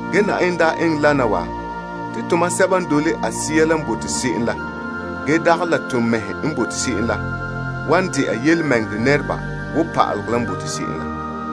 Ge Yenɛ daa eŋɛ wana te tomam sɛba n dole a Sea la n bote se'em la ge dagɛ la to mɛhe n bote se'em la, wan dɛna tontɔɔ nɛreba wo pa'alegɔ la n bote se'em la.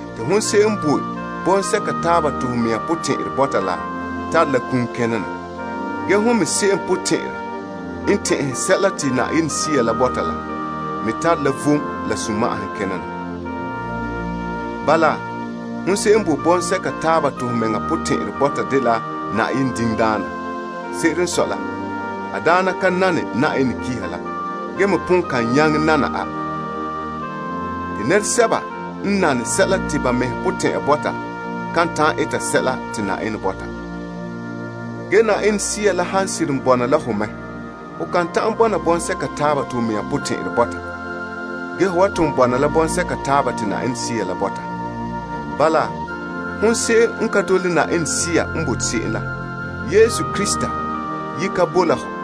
Te hon se'em n boe bɔŋsɛka taaba te ho mea potɛn'ɛrɛ bɔta la, tare la kum kena na. Ge hon me se'em potɛn'ɛrɛ n tɛn'ɛhe sɛla te Sea la bɔta la, me tare la vom la sunma'ahom kena na. Bala, hon se'em n boe bɔŋsɛka taaba te ho mɛŋa potɛn'ɛrɛ bɔta dela Yenɛ diŋdaana. Se'ere n sɔe la, a daana ka nane Yenɛ pa'alegɔ la, ge me pon ka nyaŋɛ nana a. Te nɛresɛba n nane sɛla te ba mɛhe potɛn'ɛra bɔta, kan ta'an eta sɛla te Yenɛ bɔta. Ge Yenɛ Sea la han seren bɔna la ho mɛ ho kan ta'an bɔna bɔŋsɛka taaba te ho mea potɛn'ɛrɛ bɔta ge ho wan ton bɔna la bɔŋsɛka taaba te Sea la bɔta. Bala, hon se'em n ka dole Sea n bote se'em la, Yesu Krista ye ka boe la hɔ.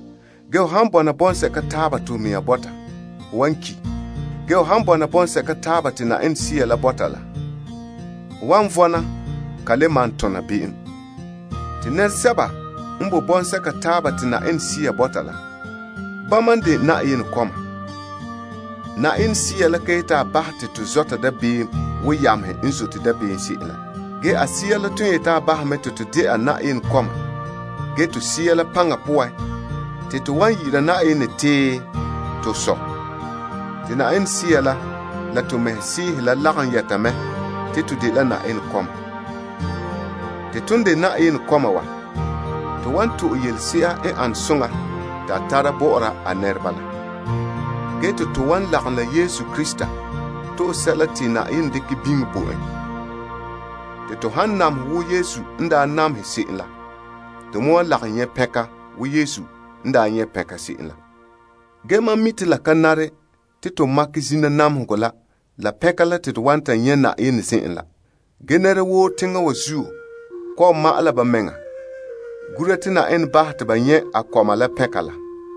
Ge ho han bɔna bɔŋsɛka taaba te ho mea bɔta, ho wan ki'. Ge ho han bɔna bɔŋsɛka taaba te Sea la bɔta la, ho wan vɔna ge te ho ka le malom tona be'em. Te nɛresɛba n boe bɔŋsɛka taaba te Yenɛ Sea bɔta la, bama n de Yenɛ kɔma. Sea la daa ka yeti a bahɛ te to zɔta dabeem wo yamehe n zote dabeem se'em la. Ge a Sea la ton yeti a bahɛ to mɛ te to de'a la Yenɛ kɔma ge te Sea la paŋa poan, te to wan yi'ira Yenɛ te, to Sɔ'. Ge te Sea la la to mɛhe sɛɛhe la lagom yɛta mɛ te to dela Yenɛ kɔma. Tomam n de Yenɛ kɔma wa, to wan to'e kan'somɔ sebo te a tara bɔ'ɔra a nɛreba la. Ge te to wan lagom la Krista to'e sɛla te Yenɛ dekɛ biŋe bo en. Te to han namehɛ wo Krista n daa namehɛ se'em la, to me wa lagom nyɛ' pɛnka wo Yesu n daa nyɛ' pɛnka se'em la. Ge mam mi' te la ka nare te to makɛ zina namehegɔ la, la pɛnka la te to wan nyɛ' Yenɛ zen'en la. Ge teŋparɛ wa zan'an kɔ'ɔn ma'ɛn la ba mea gura te Yenɛ bahɛ te ba nyɛ' a kɔma la.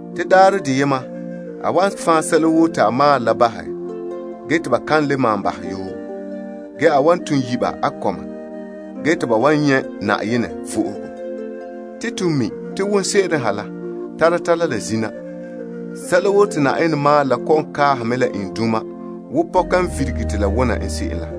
te daarɛ deyema la a wan fan' sɛla woo te a maalɛ la bahɛ, te ba kan malom bahɛ yoo, ge a wan ton yi' ba a kɔma te ba nyɛ' a vo'ohogo. To mi' te wonse'ere ha la, tara tara la zina, sɛla woo te Yenɛ maalɛ la kɔ'ɔn kaaha wo pɔka n virigere la.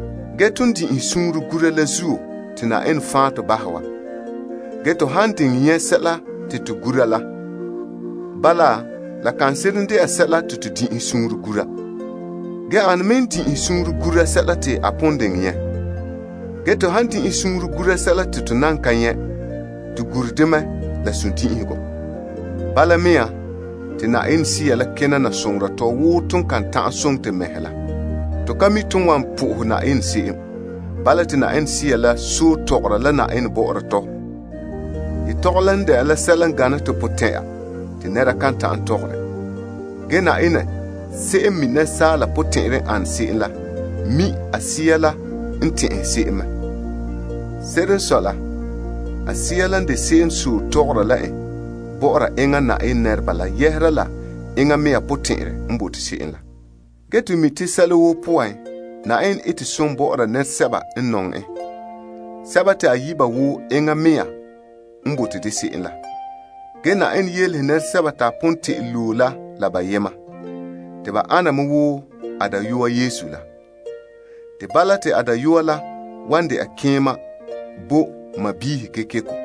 Ge ton daa din'inhe suunre gura la zuo te Yenɛ fan' tɔ bahɛ wa. Ge to han diŋɛ nyɛ' sɛla te to gura la, la le dagana la sɛla te to din'inha suunre gura, ane me n din'inhere suunre gura sɛla te a pon diŋɛ nyɛ'? Ge to han din'inhe suunre gura sɛla te to nan ka nyɛ', to gure dɛ mɛ la sundin'inhegɔ. Bala mea, te Sea la kena na soŋora tɔ wo ton kan ta'an soŋɛ to mɛhe la. Te to ka mi' ton wan sohɛ Yenɛ se'em. Bala te Sea la soha Yenɛ bɔ'ɔra tɔ la yetɔgom sebo te nɛra kan ta'an bɔkɛ bɔ. Ge Yenɛ, se'em n mi' to sunya n ane se'em la mi' a Sea la n tɛn'ɛhe se'em mɛ. Se'ere n sɔe la, a Sea la n de se'em n sɔe sohora bɔ'ɔra Yenɛ nɛreba la dɔla la Yenɛ sunboolom n de se'em. Ge to mi' sɛla woo poan, Yenɛ ete som bɔ'ɔra nɛresɛba n nɔŋɛ en, sɛba te a yi' ba wo enŋa mea n bote dɛ se'em la. Yenɛ yelege sɛba te a pon te'ele yi' me la bayema, te ba ana wo a dayɔa Yesu la. Te bala te a dayɔa la wan dɛna keema bo sɔɔnrɔ kekeko.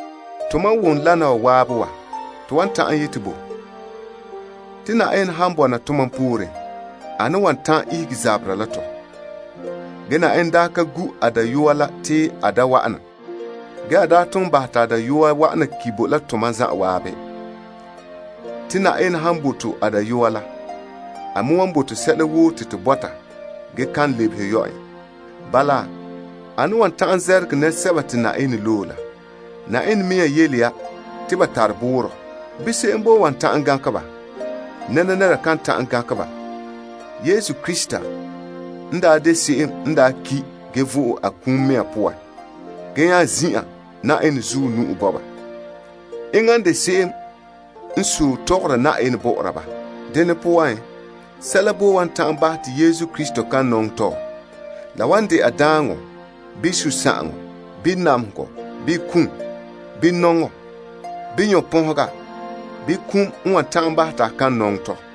Ton wom wana waabe wa to wan ta'an yeti bo? Te Yenɛ han bɔna tomam pooren, ane n wan ta'an ihege zaberɛ la tɔ? Ge Yenɛ daa ka gu' a dayɔa la te a da wa'ana. Ge a daa ton bahɛ te a dayɔa wa'ana ki' bo la tomam zanwaabe. Te Yenɛ han bo to a dayɔa la, a me wan bo to sɛla woo te to bɔta zaŋa. Bala, ane n wan ta'an zɛrɛgɛ nɛresɛba te Yenɛ loe la? Yenɛ mea yele ya te ba tare boorɔ. Bii, se'em boe wan ta'an gankɛ ba? Nɛra ka boe wan ta'an gankɛ ba. Yesu Krista, n daa de se'em n ki' ge vo'e a kum poan ge nya zin'an Yenɛ zuɔ nu'o. Enŋa n de se'em n sohe Yenɛ bɔ'ɔra tɔ. Dene poan, sɛla boe wan ta'an bahɛ te Krista kan nɔŋɛ tɔ? La wan de'a daaŋɔ bii sunsagaŋɔ bii namehegɔ bii kom, bii nɔŋɔ, bii nyɔnpɔnhega bii kum n wan ta'an bahɛ te a kan nɔŋɛ tɔ?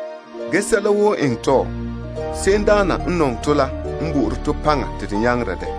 Ge sɛla woo n eŋɛ tɔ, se'emdaana n nɔŋɛ tɔ la n bo'ore to paŋa te to nyaŋera dɛ.